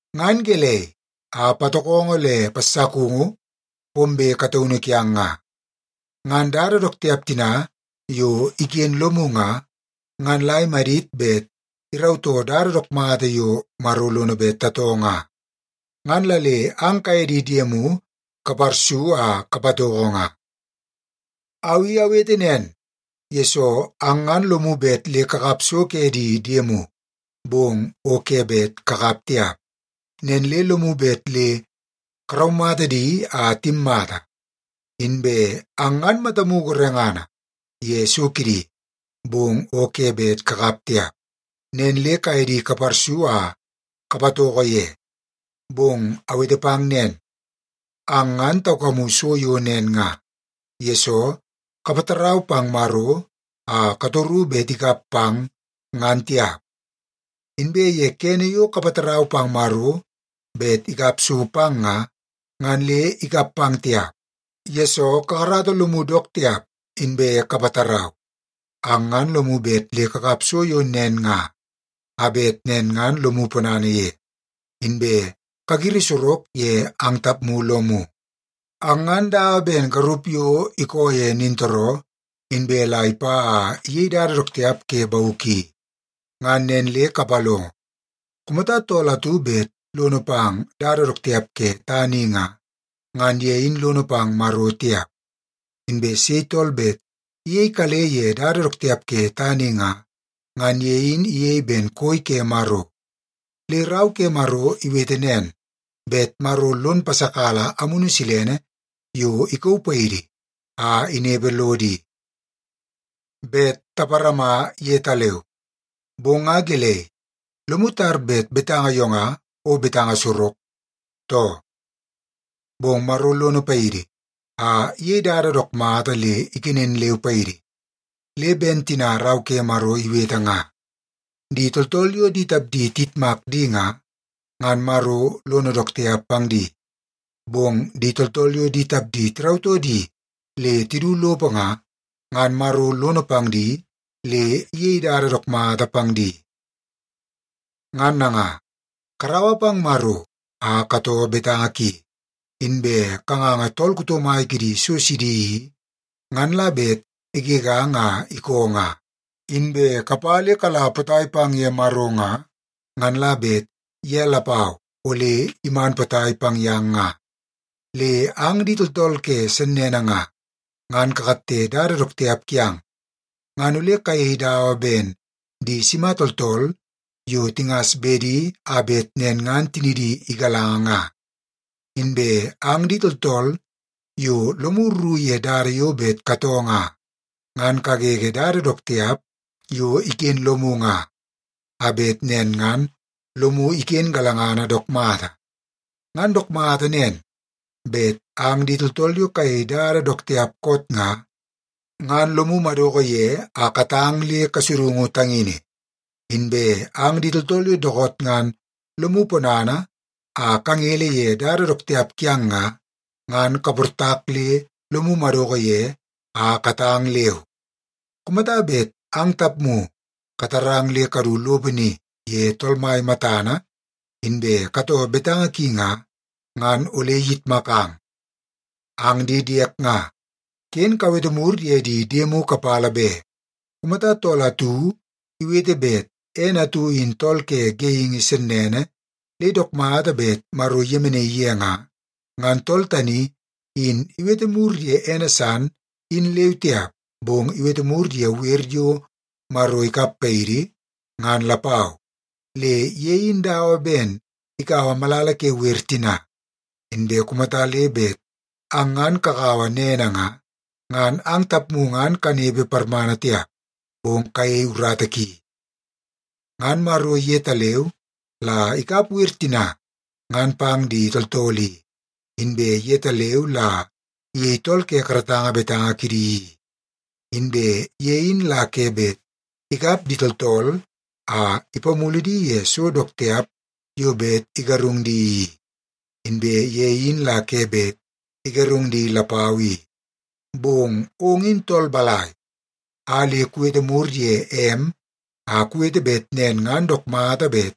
Ngan gelei a patokongo le passakungu pombe kataunu kiang nga? Ngan dada dook tiap tina yo iken lomu nga, ngan la imadit bet irautoo dada dook mata yo Maro lono bet tatoo nga, ngan la le ang kaye di diemu kaparsu a kapatoko nga. Au i awete nen, yesoo ang ngan lomu bet le kakap so ke di diemu, bong o ke bet kakap tiap. Nen le lomu bet le karaumata di a timmata. Inbe ang ngan matamu gorengana ye so kidi, bong o ke bet kakap tiap. Nen le kaye di kaparsu a kapatoko ye. Bong awete pang nen, ang ngan taukamu so yo nen nga, yesoo kapatarau pang Maro a katoru bet ikap pang, ngan tiap. Inbe ye kene yo kapatarau pang Maro bet ikap so pang nga, ngan le ikap pang tiap, yesoo kakarata lomu dook tiap inbe kapatarau. Ang ngan lomu bet le kakap so yo nen nga, a bet nen ngan lomu ponana ye, inbe kagiri sorok ye ang tapmu lomu. Ang ngan dawa ben garup yo ikoo ye nintooroo, inbe la ipa a iyei dada dook tiap ke bauk i. Ngan nen le kapalongo; kumata tool atu bet lono pang dada dook tiap ke tana i nga, ngan ye in lono pang Maro tiap. Inbe sei tool bet iyei kale ye dada dook tiap ke tana i nga, ngan ye in iyei ben koi ke Maro. Le Rau ke Maro iwete nen, bet Maro lon pasakala Amunu Silene yo ikauu paidi a inepe lodo i, bet taparama yetaleu. Bong nga gelei, lomu tar bet betanga yo nga o betanga sorok, too? Bong Maro lono paidi a iyei dada dook mata le ikenen leu paidi. Le ben tina Rau ke Maro iwete nga, “Di tooltool yo di tapdi tiyitmak di nga, ngan Maro lono dook tiap pang di. Bong di tooltool yo di tapdi tirautoo di le tidu lopo nga, ngan Maro lono pang di le iyei dada dook mata pang di.” Ngan nanga, karaua pang Maro a katoo betanga ki, inbe kanganga tool kuto mai kidi so sidi i, ngan la bet igegang a ikoo nga. Inbe kapa le kala potai pang ye Maro nga, ngan la bet ye lapau ole iman potai pang yang nga. Le ang di tooltool ke sennene nga, ngan kakatte dada dook tiap kiang. Ngan ole kayei dawa ben di sima tooltool yo tingas bedi a bet nen ngan tinidi igalanga nga. Inbe ang di tooltool yo lomu rru ye dada yo bet katoo nga, ngan kagege dada dook tiap yo iken lomu nga, a bet nen ngan lomu iken galangana dook mata. Ngan dook mata nen, bet ang di tooltool yo kayei dada dook tiap koot nga, ngan lomu madoko ye a katang le kasudungu tangini. Inbe ang di tooltool yo dookoot ngan lomu ponana a kangele ye dada dook tiap kiang nga, ngan kaportak le lomu madoko ye a katang leu. Kumata bet ang tapmu katarang le kadu lopo ni ye Tool Mai matana inbe katoo betanga ki nga, ngan ole iyitmakang. Ang di diek nga, ken kawete mur ye di diemu kapala be. Kumata tool atu iwete bet ene atu in tool ke geingi sennene le dook mata bet Maro iyemenaii ye nga, ngan tool tani in iwete mur ye ene san in leu tiap, bong iwete mur ye wer yo Maro ikap paidi, ngan lapau. Le ye in dawa ben ikaua malala ke wer tina. Inbe kumata le bet ang ngan kakaua nene nga, ngan ang tapmu ngan kanepe parmana tiap, bong kayei urata ki. Ngan Maro yetaleu la ikap wer tina ngan pang di tooltool i, inbe yetaleu la iyei tool ke karatanga betanga kidi i. Inbe ye in la ke bet ikap di tooltool a ipamulu di ye so dook tiap yo bet igarung di i, inbe ye in la ke bet igarung di lapau i. Bong ong in tool balai a le kuwete mur ye em a kuwete bet nen ngan dook mata bet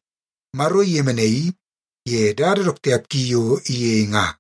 Maro iyemenaii ye dada dook tiap ki yo iyei nga?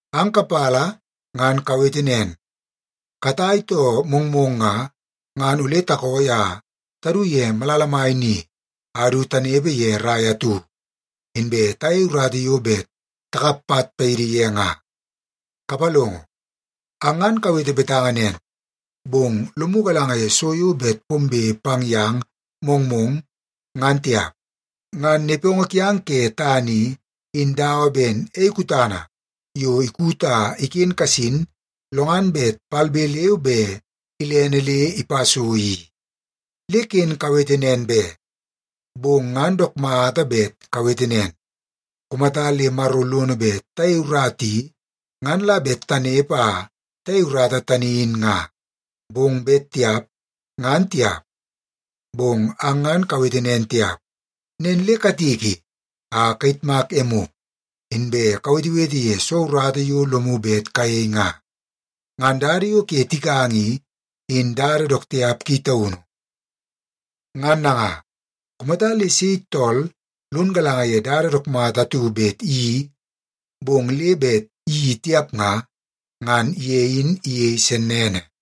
Ang kapala ngan kawete nen, “Katai too mongmong nga, ngan ole takooi a tadu ye malala mai ni a du tanepe ye rai atu, inbe tayei urata yo bet takap pat paidi ye nga.” Kapalongo, ang ngan kawete betanga nen, bong lomu galanga ye so yo bet pombe pang yang mongmong, ngan tiap. Ngan nepongo kiang ke tana i, in dawa ben ei kutana yo ikut a iken kasin lo ngan bet palbe leu be ilene le ipa so i. Le ken kawete nen be, bong ngan dook mata bet kawete nen, “Kumata le Maro lono bet tayei urata i, ngan la bet tanepe a tayei urata tani in nga. Bong bet tiap, ngan tiap.” Bong ang ngan kawete nen tiap, nen le katiki a kayitmak emu, inbe kawetewete ye soo urata yo lomu bet kayei nga. Ngan dada yo ke tikanga i, in dada dook tiap ki taunu. Ngan nanga, kumata le sei tool lon galanga ye dada dook mata atu bet iyeii, bong le bet iyeii tiap nga, ngan ye in iyei sennene.